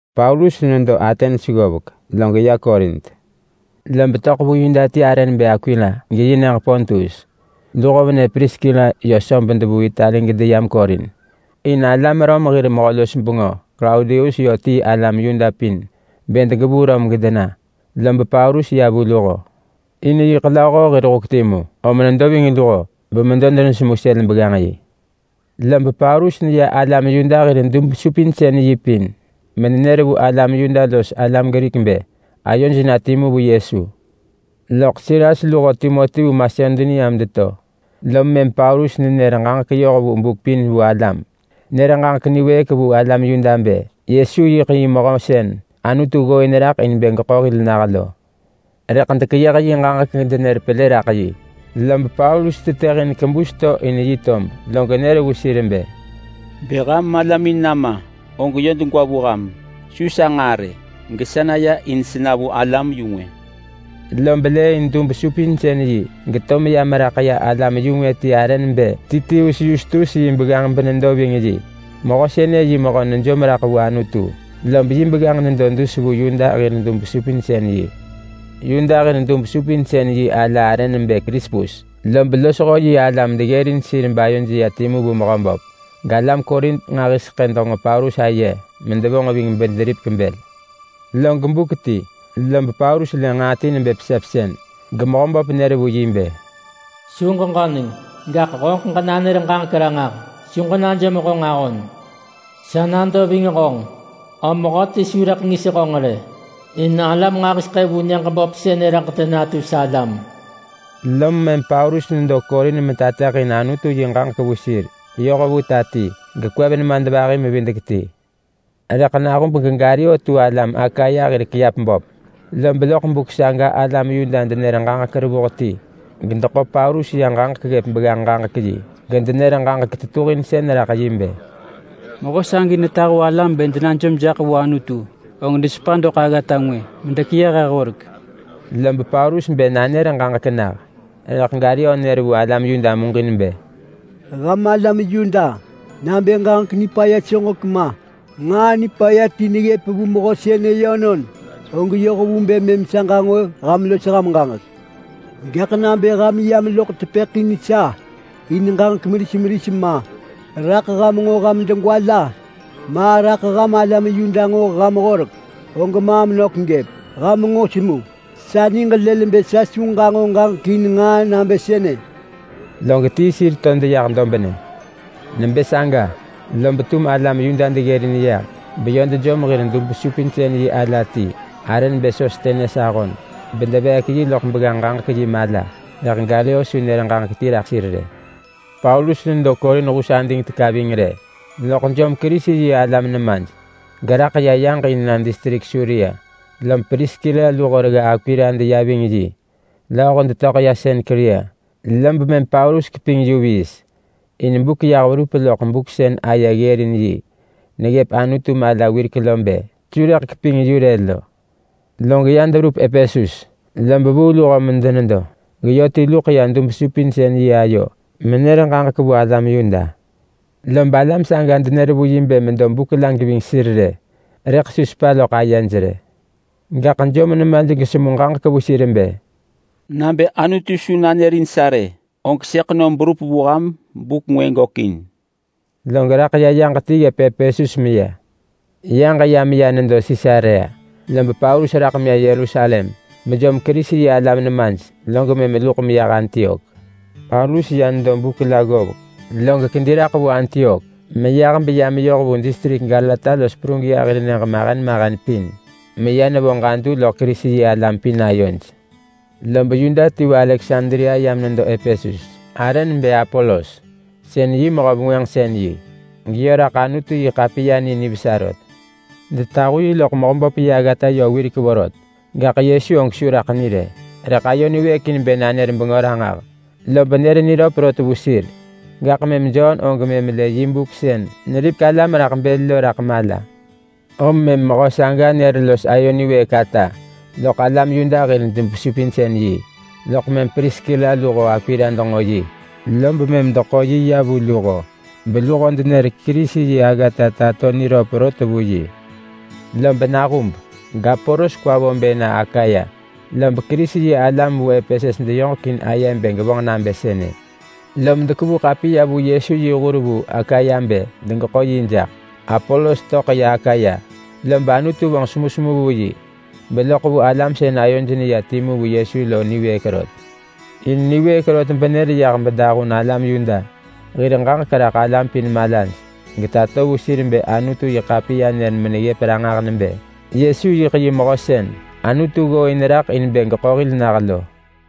Paulus nedo Atens ggovek log ya Korint. Lob töḳ vu Yuda ti arë nebë Akwila geyi nyëġ Pontus. Luho venë Priskila yö söb devuu Itali gedeyam Korint, in alam Rom hir mehö-los-bengö Klaudius yö tii alam Yuda pin bë degevuu Rom gedena. Lob Paulus ya vu luho in yiḳ lööho hir huk timu, om nedo ving luho bemedo denesemu sël begganġ-yi. Lob Paulus neya Yuda hir dub-supinsën-yi pin menenër vu alam Yuda los alam Grik bë ayoj na timu vu Yesu. Loḳ Silas luho Timoti vu Masedonia medeto, lom mëm Paulus nenër ġaġek yoh vu buk pin vu alam. Nër ġaġek niwëëk vu alam Yuda bë Yesu yiḳ yi Mehö sën Anutu ggooin raḳ in bë geḳo hil nah lo. Rëḳ dekeyëh yi ġaġek gedenër pelë raḳ yi, lob Paulus tetëhin kebus to in yi tob log nër vu sir bë, “Bë ham malamin nama, og yö degwa vu ham, su sa nġaa rë. Gesa naya in sena vu alam-yu-ngwë.” Lob lëëin dub-supinsën-yi geto meya meraḳ ya alam-yu-ngwë ti arë nebë Titius Yustus yi begganġ benedo ving yi. Mehö sënë yi mehö nejom raḳ vu Anutu, lob yi begganġ nedo dus vu Yuda hir dub-supinsën-yi. Yuda hir dub-supinsën-yi ala arë nebë Krispus, lob losho yi alam deggërin sir bayoj ya timu vu Mehöböp. Galam Korint nġahiseḳë denġo Paulus aye medevonġ ving bederipek bël. Log buk ti lob Paulus lë nġaa ti nebë pesepsën geMehöböp nër vu yi bë, “Su ġeġöneng! Gaḳ honġeḳ ġenanër ġaġek ranġah! Su ġenajom honġ ahon! Sa nado ving honġ, om mehöti su rëḳ ngis honġ rë, in alam nġahiseḳë vu nyëġ böp sënë rëḳ denatu salam.” Lom mëm Paulus nedo Korint metateḳin Anutu yi ġaġek vu sir yoh vu ta ti, gekwev nemadvahi-mevidek-ti. Rëḳ nahub geGalio tu alam Akaya hir kiap böp, lob loḳ buk saga alam Yuda denër ġaġek revuh ti gedeḳo Paulus ya ġaġek ggëp begganġ-ġaġek-yi, gedenër ġaġek tetuhinsën raḳ yi bë, “Mehö sagi netahu alam bë denajom jaḳ vu Anutu og desepa doḳ aggata ngwë medekeyëh he horek.” Lob Paulus bë nanër ġaġek nah, rëḳ Galio nër vu alam Yuda muġin bë, “Ham alam Yuda, nabë ġaġek nipaya soġek ma, nġaa nipaya ti neggëp vu mehö sënë yönon, og yoh vu bë mëm sa ġanġo ham los ham ġaġek. Gaḳ nabë ham yam loḳ tepëḳ in sa in ġaġek meris meris ma, raḳ ham nġo ham degwa la, ma raḳ ham alam Yuda nġo ham horek, og maam nök gëp! Ham nġo semu! Sa niġ lël bë sa su ġanġo ġaġek in nġaa nabë sënë!” Log tii sir to deyah dobnë. Nebë saga, lob tum alam Yuda deggërin yah beyö dejom hir dub-supinsën-yi ala ti arë nebë Sostenes ahon, bedeveek yi loḳ begganġ-ġaġek-yi mala. Rëḳ Galio su nër ġaġek ti raḳ sir rë. Paulus nedo Korint hus ading teka ving rë, loḳ jom Kerisi-yi-alam nemaj geraḳ ya yaġ in na distrik Suria. Lob Priskila luho regga Akwila deya ving yi. Lööho detöḳ ya Senkria, lob mëm Paulus keping yu viis in buk yah verup loḳ buk sën aye ggërin yi neggëp Anutu mala wirek lo bë su rëḳ keping yu rë lo. Log ya deverup Epesus lob vuu luho medenedo nyëġ sënë, geyö ti luḳ ya dub-supinsën-yi ayo menër ġaġek vu alam Yuda. Lob alam saga denër vu yi bë medo buk la geving sir rë, rëḳ su sepa loḳ ayej rë. Gaḳ jom nemaj gesemu ġaġek vu sir bë, “Nabë Anutu su nanërin sa rë, og sëḳ nom berup vu ham buk ngwë gökin.” Log raḳ ya yaġ ti ggëp Epesus meya. Yaġ ya meya nedo Sisarea, lob Paulus raḳ ya Yerusalem bejom Kerisi-yi-alam nemaj, log mëm luḳ meyah Antiok. Paulus ya nedo buk la ggovek, log kedi raḳ vu Antiok meyah beya meyoh vu distrik Galata los Prugia hir nyëġ mahen mahen pin meya nevo ġadu loḳ Kerisi-yi-alam pin ayoj. Lob Yuda ti vu Aleksandria yam nedo Epesus, arë nebë Apolos. Sën yi mehö-vengwënġsën-yi, geyö raḳ Anutu-yi-ḳapiya ni nivesa rot. Detahu yi loḳ Mehöböp yi aggata yö wirek vorot, gaḳ Yesu og su raḳ ni rë. Rëḳ ayo niwëëk in bë nanër bengö ranġah, lob nër niröp rot vu sir. Gaḳ mëm Jon og mëm lë yi buk sën neripek alam raḳ bël lo raḳ mala, om mëm mehö saga nër los ayo niwëëk ata loḳ alam Yuda hir dub-supinsën-yi. Loḳ mëm Priskila luho Akwila denġo yi lob mëm deḳo yi ya vu luho beluho denër Kerisi yi aggata tato niröp rot vu yi. Lob nahub gApolos kwa vo bë na Akaya, lob Kerisi-yi-alam vu Epesus deyoġek in aye bë gevonġ nabë sënë, lom dekevu ḳapiya vu Yesu yi hur vu Akaya bë degeḳo yi jaḳ. Apolos töḳ ya Akaya lob Anutu vonġ semusemu vu yi beloḳ vu alam sën ayoj neya timu vu Yesu lo niwëëk rot. In niwëëk rot benër yah bedahun alam Yuda hir ġaġek raḳ alam pin malaj, getato vu sir bë Anutu-yi-ḳapiya nër meneggëp ranġah nebë Yesu yiḳ yi Mehö sën Anutu ggooin raḳ in bë geḳo hil nah lo.